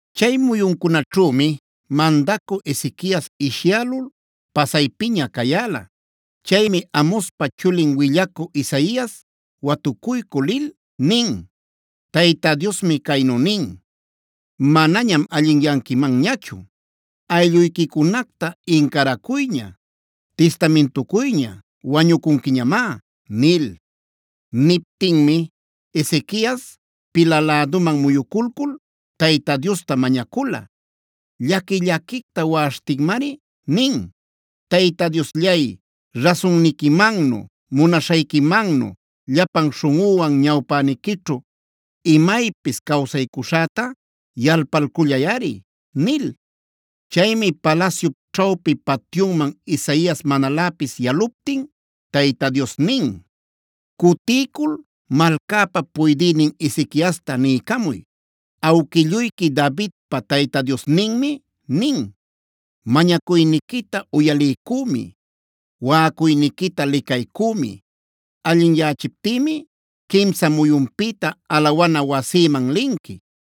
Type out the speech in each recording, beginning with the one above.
Chay muyuncunaćhümi mandacü Ezequias ishyälul pasaypiña cayäla. Chaymi Amozpa chulin willacü Isaias watucuycü lil nin: “Tayta Diosmi caynu nin: ‘Manañam allinyanquimanñachu; aylluyquicunacta incaracuyña, tistamintucuyña; wañucunquiñamá’” nil. Niptinmi Ezequias pila läduman muyuculcul Tayta Diosta mañacula. Llaqui-llaquicta waꞌaśhtinmari nin: “Tayta Diosllay, rasunniquimannu, munaśhayquimannu llapan śhunꞌüwan ñawpäniquićhu imaypis cawsaycuśhäta yalpalcullayꞌari” nil. Chaymi palasyup ćhawpi patyunman Isaias manaläpis yaluptin Tayta Dios nin: “Cutiycul malcäpa puydïnin Ezequiasta niycamuy: ‘Awquilluyqui Davidpa Tayta Diosninmi nin: Mañacuyniquita uyaliycümi, waꞌacuyniquita licaycümi. Allinyachiptïmi quimsa muyunpïta alawana wasïman linqui.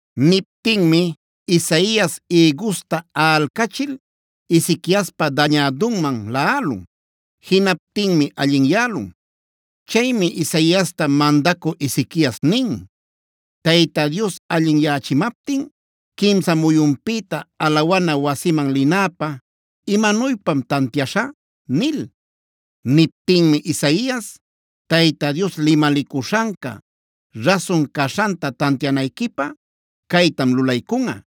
Niptinmi Isaias ïgusta aꞌalcachil, Ezequiaspa dañädunman laꞌalun. Jinaptinmi allinyälun. Chaymi Isaiasta mandacü Ezequias nin: “Tayta Dios allinyächimaptin quimsa muyunpïta alawana wasiman linäpä ¿imanuypam tantiaśhä?” nil. Niptinmi Isaias: “Tayta Dios limalicuśhanca rasun caśhanta tantianayquipä caytam lulaycunꞌa.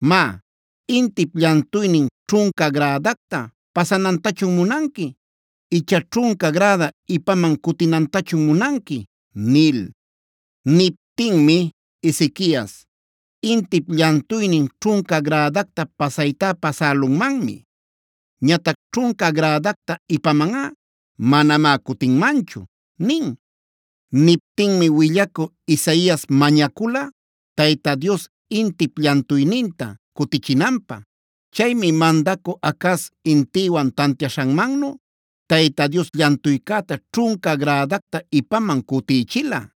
Má, ¿intip llantuynin ćhunca grädacta pasanantachun munanqui icha ćhunca gräda ipaman cutinantachun munanqui?” nil. Niptinmi Ezequias: “Intip llantuynin ćhunca grädacta pasaytá pasälunmanmi. Ñatac ćhunca grädacta ipamanꞌa manamá cutinmanchu” nin. Niptinmi willacü Isaias mañacula Tayta Dios intip llantuyninta cutichinanpä. Chaymi mandacü Acaz intiwan tantiaśhanmannu, Tayta Dios llantuycäta ćhunca grädacta ipaman cutïchila.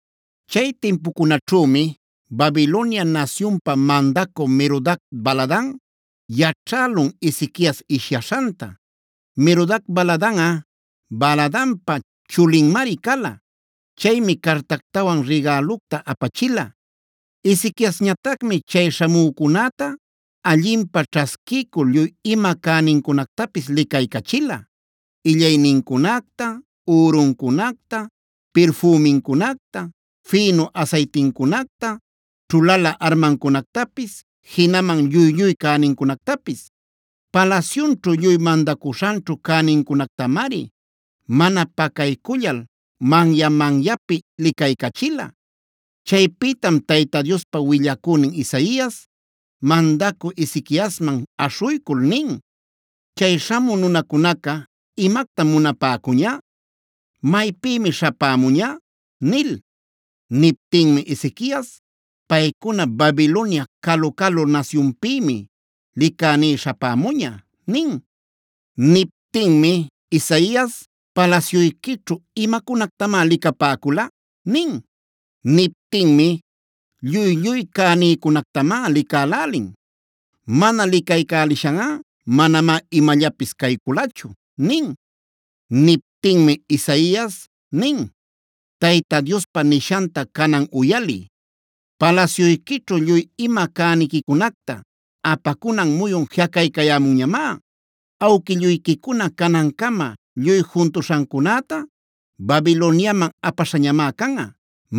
Chay timpucunaćhümi Babilonia nasyunpa mandacü Merodac-baladan yaćhälun Ezequias ishyaśhanta. (Merodac-baladanꞌa Baladanpa chulinmari cala.) Chaymi cartactawan rigälucta apachila. Ezequiasñatacmi chay śhamücunäta allinpä ćhasquiycul lluy ima cänincunactapis licaycachila: illaynincunacta, üruncunacta, pirfümincunacta, fïnu asaytincunacta, ćhulalä armancunactapis, jinaman lluy-lluy cänincunactapis. Palasyunćhu lluy mandacuśhanćhu cänincunactamari mana pacaycullal manya-manyapi licaycachila. Chaypïtam Tayta Diospa willacünin Isaias, mandacü Ezequiasman aśhuycul nin: “¿Chay śhamü nunacunaca imactam munapäcuña? ¿Maypïmi śhapämuña?” nil. Niptinmi Ezequias: “Paycuna Babilonia calu-calu nasyunpïmi licäní śhapämuña” nin. Niptinmi Isaias: “¿Palasyuyquićhu, imacunactamá licapäcula?” nin. Niptinmi: “Lluy-lluy cänïcunactamá licälälin. Mana licaycälishanꞌa manamá imallapis cayculachu” nin. Niptinmi Isaias nin: “Tayta Diospa nishanta canan uyaliy: ‘Palasyuyquićhu lluy ima cäniquicunacta apacunan muyun jiꞌacaycayämunñamá. Awquilluyquicuna canancama lluy juntuśhancunäta Babiloniaman apaśhañamá canꞌa.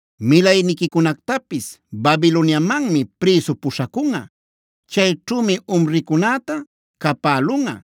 Milayniquicunactapis Babiloniamanmi prïsu puśhacunꞌa. Chayćhümi umricunäta capälunꞌa,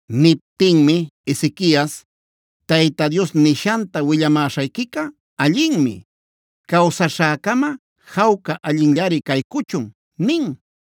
Niptinmi Ezequias: “Tayta Dios nishanta willamäśhayquica allinmi. Cawsaśhäcama jawca, allinllari caycuchun” nin.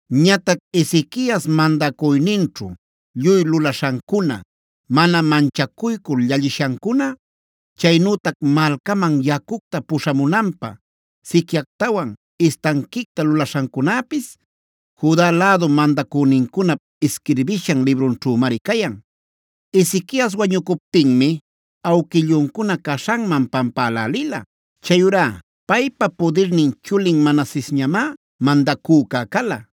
Ñatac Ezequias mandacuyninćhu lluy lulaśhancuna, mana manchacuycul llallishancuna, chaynütac malcaman yacucta puśhamunanpä siquiactawan istanquicta lulaśhancunäpis, Juda lädu mandacünincunap isquirbishan librunćhümari cayan. Ezequias wañucuptinmi awquilluncuna caśhanman pampälälila. Chayurá paypa pudirnin chulin Manasesñamá mandacüca cala.